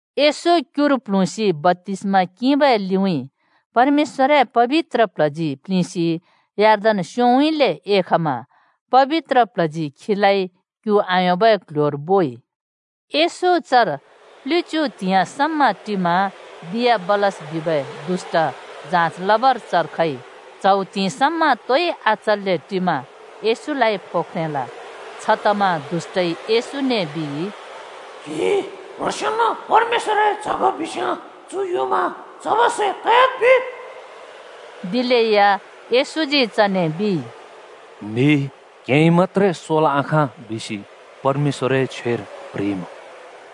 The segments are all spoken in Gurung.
येशू क्युर प्ल्हुँसि बप्‍तिस्मा किंबै लिउँइँ परमेश्‍वरए पबित्र प्ल्हजी प्लिंसि यर्दन स्‍योंउँइँले एखमा पबित्रए प्ल्हजी खीलाइ क्यु आयोंबै क्ल्ह्‍योर बोइ। येशू चर प्लिच्‍यु त्हिंइ समा टिमा दियाबलस बिबै दुष्‍ट जाँच लबर चर खइ। च्‍हौ त्हिंइ समा तोइ आचन्‍ले टिमा येशूलाइ फो ख्रेंल। छतमा दुष्‍टइ येशूने बिइ, “क्हि क्‍ह्रोंसेंन परमेश्‍वरए च्‍ह ग बिस्‍याँ चु युँमा ‘चबै सै त‍याद्’ बिद्।” दिलेया येशूजी चने बिइ, “‘म्हि क्हेंइ मत्‍त्रे सोल् आँखाँ!’ बिसि परमेश्‍वरए छ्वेर प्‍ह्रिइमुँ।”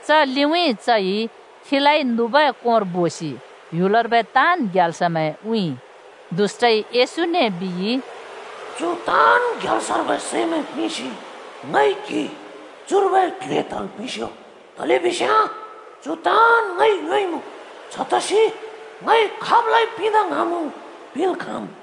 च लिउँइँ चइ खीलाइ नुबै कोंर बोसि ह्‍युलर्बै ताँन् ग्याल्समैं उँइँइ। दष्‍टइ येशूने बिइ, “चु ताँन् ग्याल्सर्बै सैमैं पिंसि ङइ क्‍हि चुर्बै क्ल्हे तल् पिंस्‍यो। तलेबिस्याँ चु ताँन् ङइ योंइमुँ छतसि ङइ खाबलाइ पिंदा ङ्हाँमुँ पिंल् खाँम्।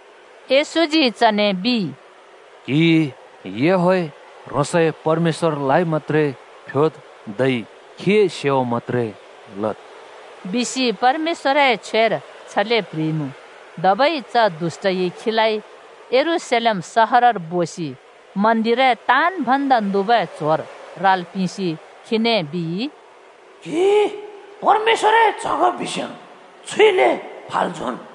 येशूजी चने बिइ, “क्‍हिइ याहवेह ह्रोंसए परमेश्‍वरलाइ मत्‍त्रे फ्‍योद्, धै खीए सेवा मत्‍त्रे लद्,” बिसि परमेश्‍वरए छ्वेर छले प्‍ह्रिइमुँ। धबै च दुष्‍टइ खीलाइ यरूशलेम सहरर बोसि मन्दिरए ताँन् भन्दा नुबै च्‍होर राल् पिंसि खीने बिइ, “क्‍हि परमेश्‍वरए च्‍ह ग बिस्‍याँ छुइले फाल् झोंन्।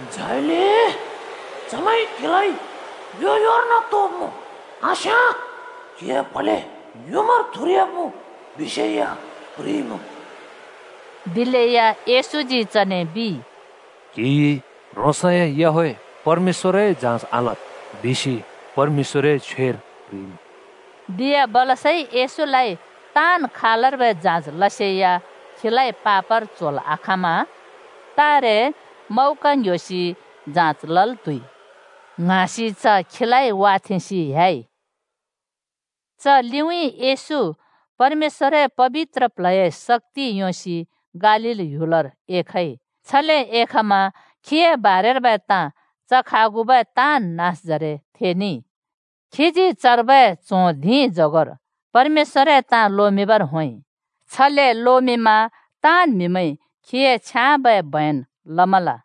झाइले चमैंइ क्‍हिलाइ यो-योर्न तोब्मुँ, आस्याँ क्हिए प्‍हले युँमार थुरयाब्मुँ,’ बिसेया प्ह्रिइमुँ।” दिलेया येशूजी चने बिइ, “‘क्‍हिइ ह्रोंसए याहवेह परमेश्‍वरए जाँच आलद्,’ बिसि परमेश्‍‍वरए छ्वेर प्ह्रिइमुँ।” दियाबलसइ येशूलाइ ताँन् खालर्बै जाँच लसेया खीलाइ पापर च्होल् आखाँमा “तारे मौका ङ्‍ह्‍योसि जाँच लल् त्हुइ” ङ्हाँसि च खीलाइ वाथेंसि ह्‍याइ। च लिउँइँ येशू परमेश्‍वरए पबित्र प्ल्हए शक्‍ति योंसि गालील ह्‍यु‍लर एख‍इ। छले एखमा खीए बारेर्बै ताँ च खागुबै ताँन् नाँसजरे थेनेइ। खीजी चर्बै च्हों धिंजगोर परमेश्‍वरए ताँ लोमिंबर होंइ। छले लोमिंमा ताँन् म्‍हिमैंइ खीए छ्याँबै बयन लमल।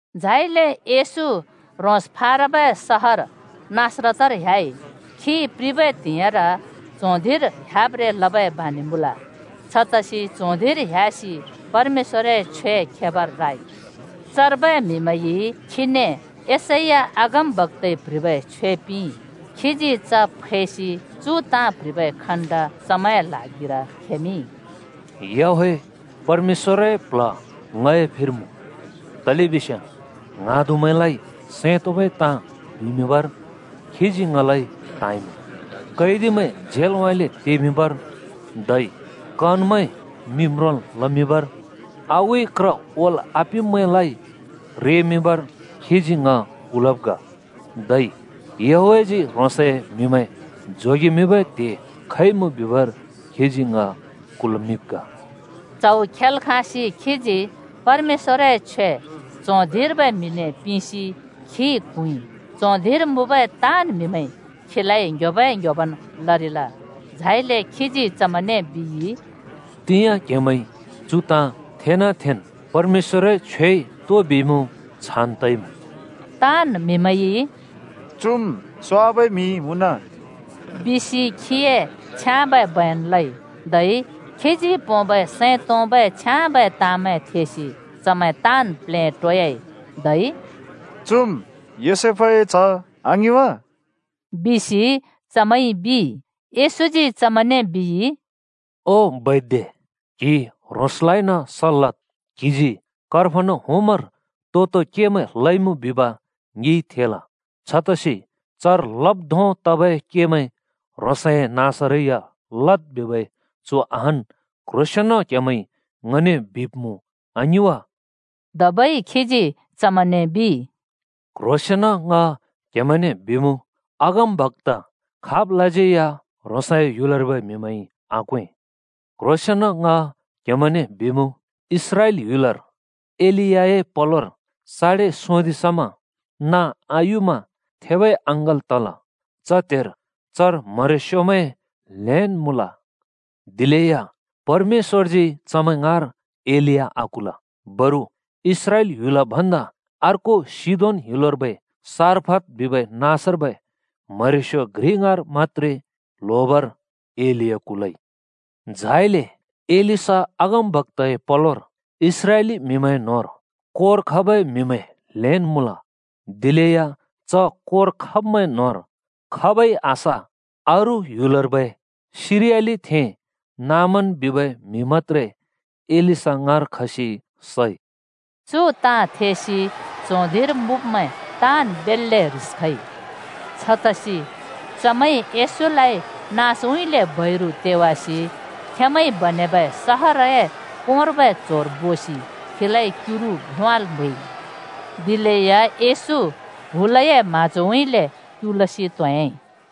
झाइले येशू ह्रोंस फाराबै सहर नासरतर ह्‍याइ। खी प्रिबै त्हिंइर च्हों धिंर ह्‍याब्रें लबै बाँनि मुँल। छतसि च्हों धिंर ह्‍यासि परमेश्‍वरए छ्वे खेबर राइ। चर्बै म्हिमैंइ खीने यशैया अगमबक्‍ताइ प्‍ह्रिबै छ्वे पिंइ। खीजी च फैसि चु ताँ प्ह्रिबै खण्ड चमैंए ल्हागिर खेमिंइ: “याहवेह परमेश्‍वरए प्‍ल्ह ङए फिर मुँ, तलेबिस्याँ ङ्हाँदुमैंलाइ सैं तोंबै ताँ बिमिंबर खीजी ङलाइ त्हाँइमुँ। कैदिमैं झेलउँइँले तेमिंबर, धै कनमैं मि म्रोंल् लमिंबर। आगुइ क्र ओल् आपिंब्मैंलाइ रेमिंबर खीजी ङ कुल्मिंब् ग। धै याहवेहजी ह्रोंसए म्हिमैं जोगेमिंबै त्हे खइमुँ बिबर खीजी ङ कुल्मिंब् ग।” च्‍हौ खेल् खाँसि खीजी परमेश्‍वरए छ्वे च्हों धिंर्बै म्हिने पिंसि खी क्हुँइ। च्हों धिंर मुँबै ताँन् म्‍हिमैंइ खीलाइ ङ्‍ह्‍योबै ङ्‍ह्‍योबन् लरिल। झाइले खीजी चमैंने बिइ, “तिंयाँ क्‍हेमैंइ चु ताँ थेना थेन् परमेश्‍वरए छ्वेइ तो बिइमुँ छान् तइमुँ।” ताँन् म्हिमैंइ “चुम् स्‍वाबै म्हि मुँन!” बिसि खीए छ्याँबै बयन लइ, धै खीजी पोंबै सैं तोंबै छ्याँबै ताँमैं थेसि चमैं ताँन् प्लेटोयाइ। धै “चुम् योसेफए च्‍ह आङिं वा?” बिसि चमैंइ बिइ। येशूजी चमैंने बिइ, “ओ बैद्य, क्‍हि ह्रोंसलाइन सल् लद्‍। क्हिजी कफर्नहुमर तो-तो केमैं ल‍इमुँ बिब ङिंइ थेल। छतसि चर लब् धों तबै केमैं ह्रोंसए नाँसरै या लद्‍ बिबै चु अहान् क्ह्रोसेंन क्‍हेमैंइ ङने बिब्मुँ आङिं वा।” धबै खीजी चमैंने बिइ, “क्ह्रोसेंन ङ क्हेमैंने बिमुँ, अगमबक्‍ता खाबलाज्यै या ह्रोंसए ह्‍युलर्बै म्‍हिमैंइ आक्‍वें। क्‍ह्रोंसेंन ङ क्‍हेमैंने बिमुँ, इस्राएल ह्‍युलर एलियाए पलोर साडे सोंदिं समा नाँ आयुमा थेबै अँङ्गल् तल। च त्‍हेर चर म्हरेस्योमैं ल्हेंन् मुँल। दिलेया परमेश्‍वरजी चमैं ङाँर एलिया आकुल। बरु इस्राएल ह्‍युल भन्दा अर्को सिदोन ह्‍युलर्बै सारफत बिबै नाँसर्बै म्हरेस्यो घ्रि ङाँर मत्‍त्रे ल्होबर एलिया कुलइ। झाइले एलीशा अगमबक्‍ताए पलोर इस्राएली म्‍हिमैं न्‍होंर कोर खबै म्‍हिमैं ल्हेंन् मुँल। दिलेया च कोर खब्‍मैं न्होंर खाबै आस, अरू ह्‍युलर्बै सिरियालिथें नामान बिबै म्‍हि मत्‍त्रे एलीशा ङाँर खसि सइ।” चु ताँ थेसि च्हों धिंर मुँब्‍मैं ताँन् बेल्‍ले ह्रिस खइ। छतसि चमैंइ येशूलाइ नाँसउँइँले बैरु तेवासि खेंमैंइ बनेबै सहरए कोंर्बै च्होर बोसि खीलाइ क्युरु भ्‍योंवाल् म्हैइ। दिलेया येशू हुलए म्‍हाँजोउँइँले क्युलसि त्होंह्‍याइ।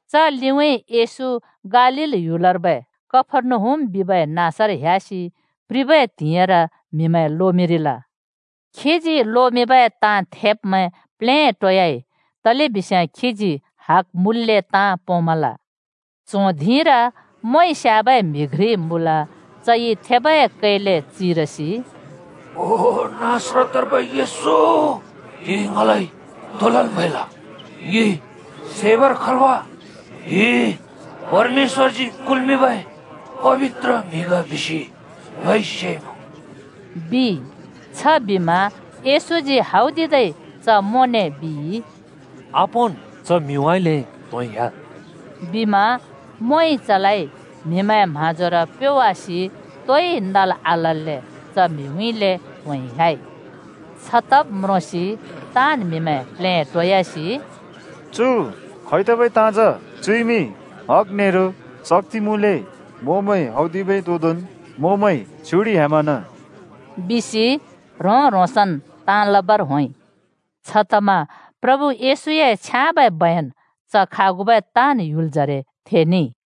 च लिउँइँ येशू गालील ह्‍युलर्बै कफर्नहुम बिबै नाँसर ह्‍यासि प्रिबै त्हिंइर म्हिमैं लोमिंरिल। खीजी लोमिंबै ताँ थेब्मैं प्लेटोयाइ तलेबिस्याँ खीजी हग मुँल्‍ले ताँ पोंमल। च्हों धिंर मोंइ स्‍याबै म्‍हि घ्रि मुँल। चइ थेबै कैले चिरसि, “ओ नासरतर्बै येशू, क्‍हिइ ङिलाइ तो लल् म्‍हैल? ङि सैबर खल् वा? क्‍हि परमेश्‍वरजी कुल्मिंबै पबित्र म्‍हि ग बिसि ङइ सेइमुँ।” बिइ। छबिमा येशूजी हौदिदै च मोंने बिइ, “आपोंन्, च म्हिउँइँले त्‍होंइ ह्‍याद्।” बिमा मोंइ चलाइ म्हिमैंए म्हाँजोर प्योवासि तोइ नल् आलल्‍ले च म्हिउँइँले त्होंइ ह्‍याइ। छ तब् म्रोंसि ताँन् म्‍हिमैं प्लेटोयासि “चु खैतबै ताँ जा? चुइमि हग नेरो शक्‍ति मुँल्‍ले मोंमैं हौदिबै तोदोंन् मोंमैं छ्युडिह्‍यामना बिसि ह्रों-ह्रोंसन् ताँ लबर होंइ।” छतमा प्रभु येशूए छयाँबै बयन च खागुबै ताँन् ह्‍युलजरे थेनेइ।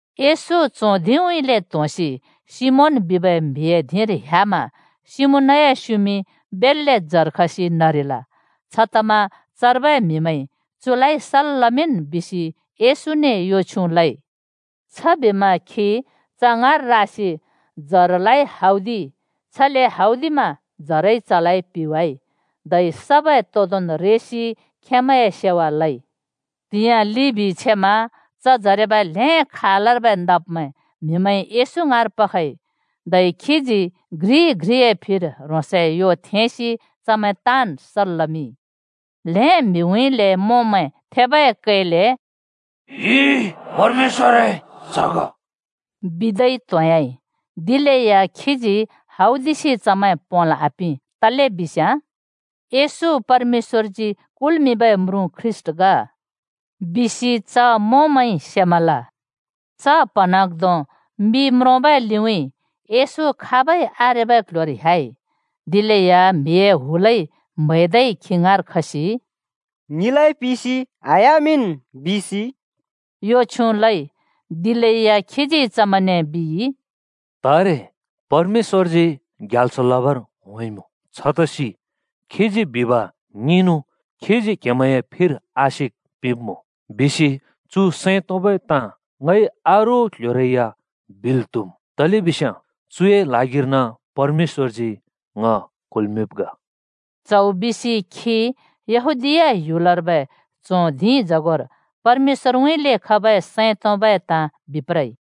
येशू च्हों धिंउँइँले त्‍होंसि सिमोन बिबै म्‍हिए धिंर ह्‍यामा सिमोनए स्‍युमिं बेल्‍ले जर खसि नरिल। छतमा चर्बै म्‍हिमैंइ चुलाइ सल् लमिंन् बिसि येशूने यो छ्‍युँ लइ। छबिमा खी च ङाँर रासि जरलाइ हौदि‌इ, छले हौदिमा जरइ चलाइ पिवाइ। धै सबै तोदोंन् रेसि खेंमैंए सेवा लइ। त्‍हिंयाँ लिबि छेमा च जरेबै ल्हें खालर्बै नब्‍मैं म्हिमैंइ येशू ङाँर पखइ। धै खीजी घ्रि-घ्रिए फिर ह्रोंसए यो थेंसि चमैं ताँन् सल् लमिंइ। ल्हें म्हिउँइँले मोंमैं थेबै कैले “क्‍हि परमेश्‍वरए च्‍ह ग,” बिदै त्होंयाइ। दिलेया खीजी हौदिसि चमैं पोंल् आपिं। तलेबिस्याँ “येशू परमेश्‍वरजी कुल्‍मिंबै म्रुँ ख्रीष्‍ट ग!” बिसि च मोंमैंइ सेमल। च प्‍हँन्हाँग्धों मि म्रोंबै लिउँइँ येशू खाबै आरेबै क्‍ल्‍ह्‍योर ह्‍याइ। दिलेया म्‍हिए हुलइ म्‍है‍दै खी ङाँर खसि “ङिलाइ पिसि आह्‍यामिंन् बिसि,” यो छ्युँ लइ। दिलेया खीजी चमैंने बिइ, “तारे परमेश्‍वरजी ग्याल्स लबर होंइमुँ। छतसि खीजी बिब ङिंनु, खीजी क्‍हेमैंए फिर आशिक पिंब्‍मुँ। बिसि चु सैं तोंबै ताँ ङइ अरू क्ल्ह्‍योरै या बिल् त्‍हुम्। तलेबिस्याँ चुए ल्हागिर्न परमेश्‍वरजी ङ कुल्‍मिंब् ग।” च्हौ बिसि खी यहूदीया ह्‍युलर्बै च्हों धिंजगोर परमेश्‍वरउँइँले खबै सैं तोंबै ताँ बिप्रइ।